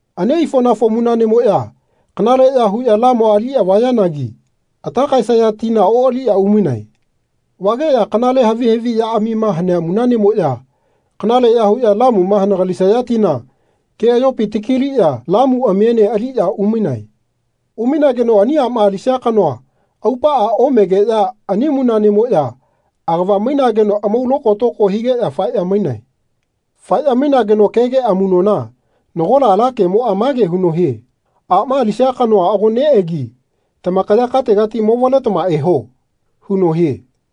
Ani aifoꞌnafo munaꞌnemoꞌya kanaleꞌya huꞌya lamua aliꞌya vayanagi ata kaesaya tina oꞌaliꞌya umainae. Vageꞌya kanale havi haviꞌyaꞌamima hanea munaꞌnemoꞌya kanaleꞌya huꞌya lamuma hanagalisaya tina keꞌayopi taki-liꞌya lamuꞌamiene aliꞌya umainae. Umainageno ani aꞌma alisia kanoa aupaꞌa omegeꞌya ani munaꞌnemoꞌya agava-mainageno amau lokotoko higeꞌya faeꞌya mainae. Faeꞌya mainageno kege amuꞌnona nagola ala kemoꞌa mage huno hie “Aꞌma alisia kanoa ago neꞌegi tamakaya kategati movaletama eho.” huno hie.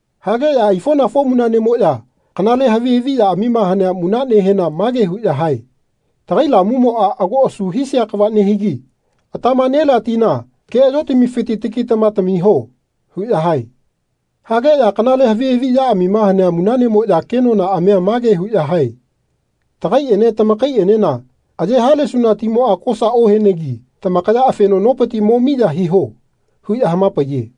Hageꞌya aifoꞌnafo munaꞌnemoꞌya kanale havi haviꞌyamima hanea munaꞌnehena mage huꞌya hae “Tagai lamumoꞌa ago asu hisia kava nehigi atama nelea tina keꞌayopitamifiti takitama tamiho.” huꞌya hae. Hageꞌya kanale havi haviꞌyamima hanea munaꞌnemoꞌya kenonaꞌamia mage huꞌya hae “Tagaiꞌene tamakaiꞌenema aye halesuna timoꞌa kosa ohenegi tamakaya afeno nopiti mo miya hiho.” huꞌya hama-paiye.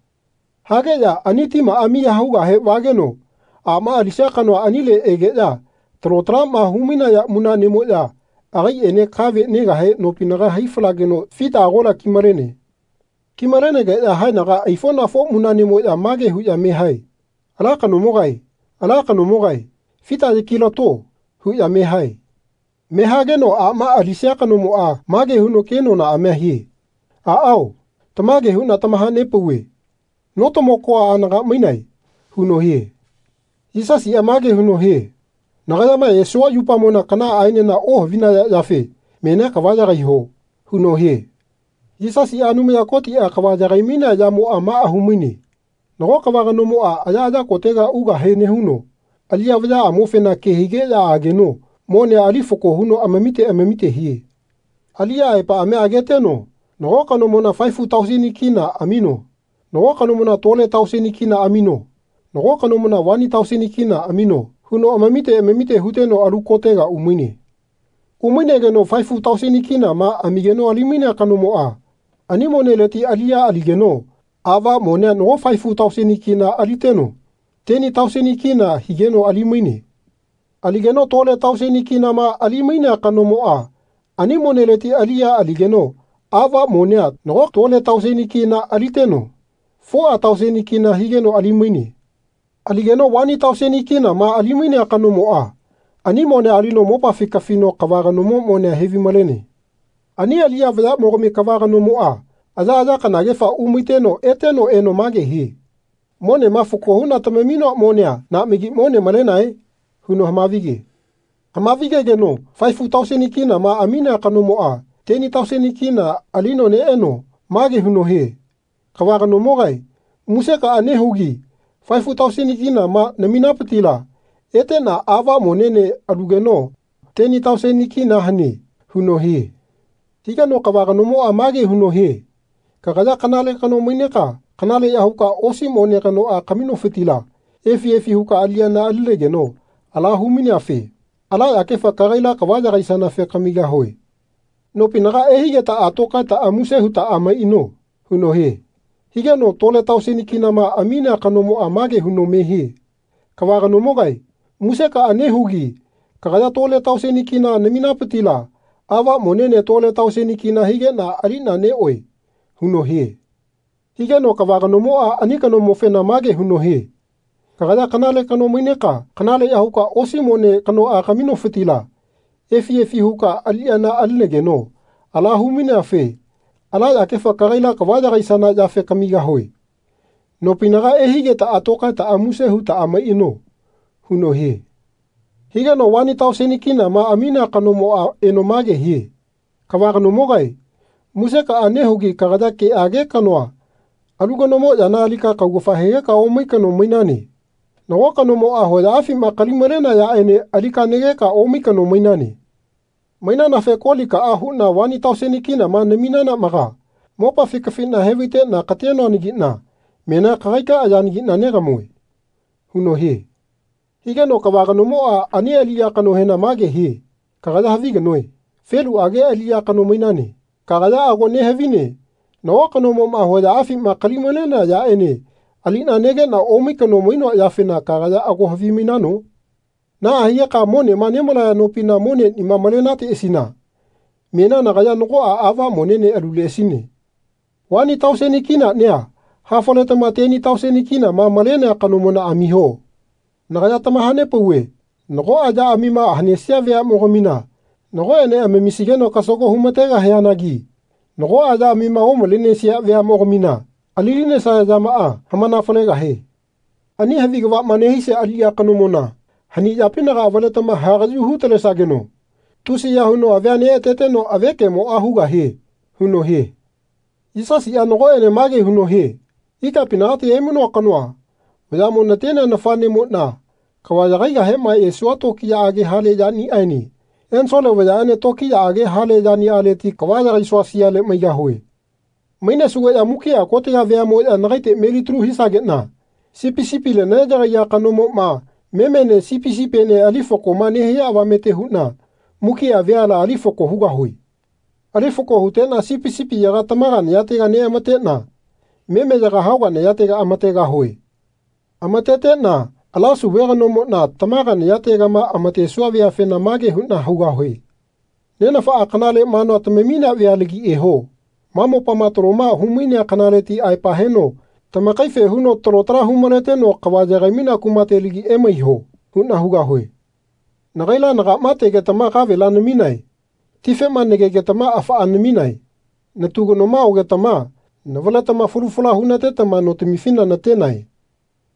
Hageꞌya ani timaꞌa miya hugahe vageno aꞌma alisia kanoa anile egeꞌya talo talaꞌma hu-malaya munaꞌnemoꞌya agaiꞌene ala kave negahe nopinaga hai-falageno fita agola ki-malene. Ki-malenegeꞌya haenaga aifonafo munaꞌnemoꞌya mage huꞌya me hae “Ala kanomogae ala kanomogae fita yaki-la-to.” huꞌya me hae. Me hageno aꞌma alisia kanomoꞌa mage huno kenonaꞌamia hie “Aꞌao tamage huꞌna tamaha-nepauve no-tama-koa anaga emainae.” huno hie. Yisasiꞌa mage huno hie “Nagayama esua yupamona kanaꞌaenena ohavinaya yafe menia kava yagaiho.” huno hie. Yisasiꞌa Anumaya Kotiꞌa kava yagai-mainea yamoꞌa maꞌa hu-maine “Nago kava kanomoꞌa ayaꞌaya kotega ugahe nehuno aliꞌya vayaꞌamofena ke higeꞌya ageno monea ali fako huno amamite amamite hie. Aliꞌya aepaꞌamia ageteno nago kanomona faefu tauseni kina (K5,000) amino nago kanomona tole tauseni kina (K2,000) amino nago kanomona vani tauseni kina (K1,000) amino huno amamite amamite huteno alu kotega umaine. Umainegeno faefu tauseni kinama (K5,000) amigeno ali-mainea kanomoꞌa ani moneleti aliꞌya aligeno aꞌva monea nago faefu tauseni kina (K5,000) aliteno teni tauseni kina (K10,000) higeno ali-maine. Ali-geno tole tauseni kinama (K2,000) ali-mainea kanomoꞌa ani moneleti aliꞌya aligeno aꞌva monea nago tole tauseni kina (K2,000) aliteno foꞌa tauseni kina (K4,000) higeno ali-maine. Ali-geno vani tauseni kinama (K1,000) ali-mainea kanomoꞌa ani monea alino mopafi kafino kava kanomo monea he-vai-malene. Ani aliꞌya vayaꞌmogami kava kanomoꞌa ayaꞌaya kanagefa umaiteno eteno eno mage hie ‘Monema fako huꞌna tamaminoa monea naꞌmagi mone malenae?)’ huno hama-vige. Hama-vigegeno faefu tauseni kinama (K5,000) aminea kanomoꞌa teni tauseni kina (K10,000) alino neꞌeno mage huno hie ‘Kava kanomogae musekaꞌa nehugi faefu tauseni kinama (K5,000) naminapitila eteꞌna aꞌva monene alugeno teni tauseni kina (K10,000) hane.’ huno hie. Higeno kava kanomoꞌa mage huno hie ‘Kagaya kanale kano maineka kanaleꞌya huka osi mone kanoꞌa kaminofitila efi efi huka aliꞌyana alinageno ala hu-maineafe ala yakefa kagaila kava yagaisanafe kamigahue. Nopinaga ehaigetaꞌa tokaetaꞌa muse hutaꞌa maiꞌano.’ huno hie Higeno tole tauseni kinama (K2,000) aminea kanomoꞌa mage huno me hie ‘Kava kanomogae musekaꞌa nehugi kagaya tole tauseni kina (K2,000) naminapitila aꞌva monene tole tauseni kina (K2,000) higeꞌna aliꞌna neꞌoe.’ huno hie. Higeno kava kanomoꞌa ani kanomofena mage huno hie ‘Kagaya kanale kano maineka kanaleꞌya huka osi mone kanoꞌa kaminofitila efi efi huka aliꞌyana alinageno ala hu-maineafe ala yakefa kagaila kava yagaisana yafe kamigahue. Nopinaga ehaigetaꞌa tokaetaꞌa muse hutaꞌa maiꞌano.’ huno hie. Higeno vani tauseni kinama (K1,000) aminea kanomoꞌa eno mage hie ‘Kava kanomogae musekaꞌa nehugi kagaya keꞌage kanoa alu kanomo yana alika kaugafa hegeka omai kano mainane. Nago kanomoꞌa hoyaꞌafima kali-malenea yaꞌene alika negeka omai kano mainane. Mainanafe kolikaꞌa huꞌna vani tauseni kinama (K1,000) naminanaꞌmaga mopafi kafiꞌna he-vaiꞌna ka-tenoanagiꞌna menia kagaikaꞌa yanagiꞌna negamue.’ huno hie. Higeno kava kanomoꞌa ani aliꞌya kanohena mage hie ‘Kagaya havi kanoe. Feluꞌage aliꞌya kano mainane. Kagaya ago nehavine nago kanomoꞌma hoyaꞌafima kali-malenea yaꞌene aliꞌna negeꞌna omai kano mainoa yafena kagaya ago havimainano? Naꞌa higeka monema nemalaya nopina moneꞌnima malenateꞌasina menia nagaya nagoꞌa aꞌva monene aluleꞌasine. Vani tauseni (K1,000) kinaꞌnia hafaletama teni tauseni kinama (K10,000) malenea kanomona amiho. Nagaya tamaha-nepauve nagoꞌa yaꞌamima hanesia veaꞌmogamina nagoꞌene amamisigeno kasago hu-ma-tegahianagi nagoꞌa yaꞌamima omalenesia veaꞌmogamina ali-linesaya yamaꞌa hamana-falegahie. Ani havi kavaꞌma nehisia aliꞌya kanomona hani yapinaga avaletama hagaꞌyu hu-talesageno tusiya huno avia neꞌateteno avekemoꞌa hugahie.’ huno hie.” Yisasiꞌa nagoꞌene mage huno hie Ikapinagati emainoa kanoa vayaꞌmo natenea nafaꞌnemoꞌna kava yagaigahema esuana tokiyaꞌage hale yaniꞌaene ensole vayaꞌene tokiyaꞌage hale yaniꞌaleti kava yagaisua siale maigahue. Mainesugeꞌya mukiꞌa kotega veaꞌmoꞌya nagaite melitalu hisageꞌna sipi sipile neꞌyagaiya kanomoꞌma memene sipi sipiene ali fakoma nehia avamete huꞌna mukiꞌa veala ali fako hugahue. Ali fako huteꞌna sipi sipiyaga tamaga nayatega neꞌamateꞌna memeyaga hauga nayatega amategahue. Amateteꞌna ala sauve kanomoꞌna tamaga nayategama amatesua veafena mage huꞌna hugahue “Nenafaꞌa kanale manua tamaminea vealagi eho. Ma mopama taloma hu-mainea kanaleti aepa heno tamakaife huno talo tala hu-maleteno kava yagai-mainea kumatelagi emaiho.” huꞌna hugahue. “Nagaila nagaꞌma tegetama kavela naminae. Tifema nagegetama afaꞌa naminae. Natu kanoma ogetama navaletama falu fala hu-natetama notamifina na-tenae.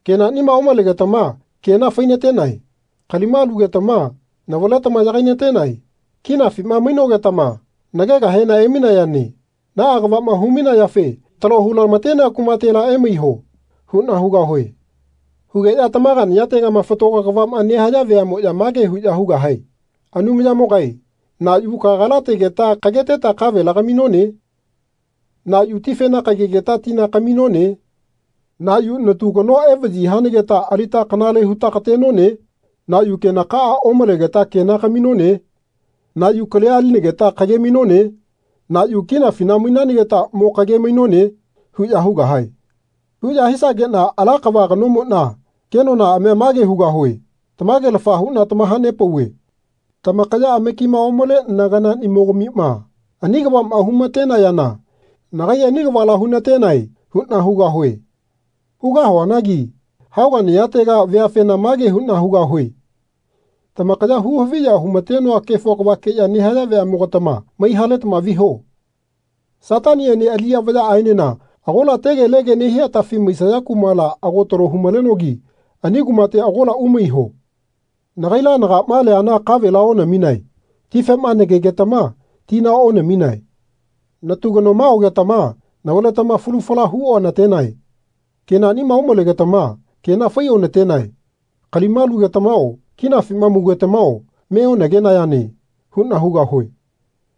Kenaꞌnima omalegetama kena fai-natenae. Kalima alugetama navaletama yagai-natenae. Kinafima mainogetama nagegahena emainayane. Naꞌa kavaꞌma hu-mainayafe talo hu-lama-tenea kumatela emaiho.” huꞌna hugahue. Hugeꞌya tamaga nayategama fatago kavaꞌma nehaya veaꞌmoꞌya mage huꞌya hugahae “Anumayamogae na yu kagala tegeta kageteta kavela kaminone? Na yu tifena kagegeta tina kaminone? Na yu natu kanoa evaꞌyi hanageta alita kanale huta ka-tenone? Na yu kenakaꞌa omalegeta kena kaminone? Na yu kalia alinageta kage-mainone? Na yu kinafina mainanageta mo kage-mainone?” huꞌya hugahae. Huꞌya hisageꞌna ala kava kanomoꞌna kenonaꞌamia mage hugahue “Tamagelafa huꞌna tamaha-nepauve tamakaya amakima omale naganaꞌnimogamima ani kavaꞌma hu-ma-tayana nagai ani kavala hu-natenae.” huꞌna hugahue. Hugahuanagi haoga nayatega veafena mage huꞌna hugahue “Tamakaya hu-haviya hu-matenoa kefo kavakeꞌya nehaya veaꞌmogatama mai-haletama viho. Sataniꞌene aliꞌya vayaꞌaenena agola tegelege nehia atafi maisaya kumala ago talo hu-malenogi ani kumate agola umaiho. Nagaila nagaꞌma liana kavela onaminae. Tifema nagegetama tina onaminae. Natu kanoma ogetama navaletama falu fala hu-ona-tenae. Kenaꞌnima omalegetama kena fai-ona-tenae. Kalima alugetamao kinafima maugetamao me onagegenayane.” huꞌna hugahue.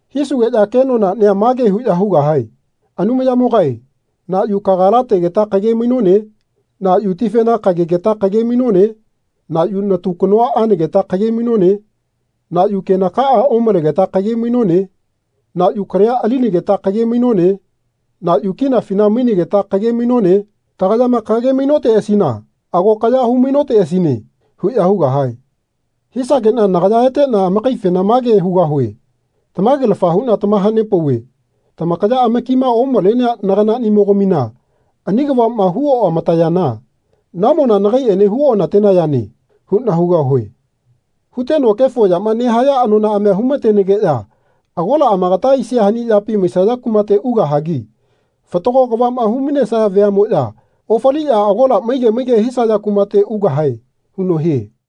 Hisugeꞌya kenonaꞌnia mage huꞌya hugahae “Anumayamogae na yu kagala tegeta kage-mainone? Na yu tifena kagegeta kage-mainone? Na yu natu kanoa anageta kage-mainone? Na yu kenakaꞌa omalegeta kage-mainone? Na yu kalia alinageta kage-mainone? Na yu kinafina mainanageta kage-mainone? Tagayama kage-mainoteꞌasina ago kaya hu-mainoteꞌasine.” huꞌya hugahae. Hisageꞌna nagaya eteꞌna amakaifena mage hugahue “Tamagelafa huꞌna tamaha-nepauve tamakaya amakima omalenea naganaꞌnimogamina ani kavaꞌma hu-oꞌama-tayana namona nagaiꞌene hu-ona-tenayane.” huꞌna hugahue. Huteno kefo yama nehaya anonaꞌamia hu-ma-tenageꞌya agola amakata aisia hani yapi maisaya kumate ugahagi fatago kavaꞌma hu-mainesaya veaꞌmoꞌya ofaliꞌya agola maige maige hisaya kumate ugahae huno hie.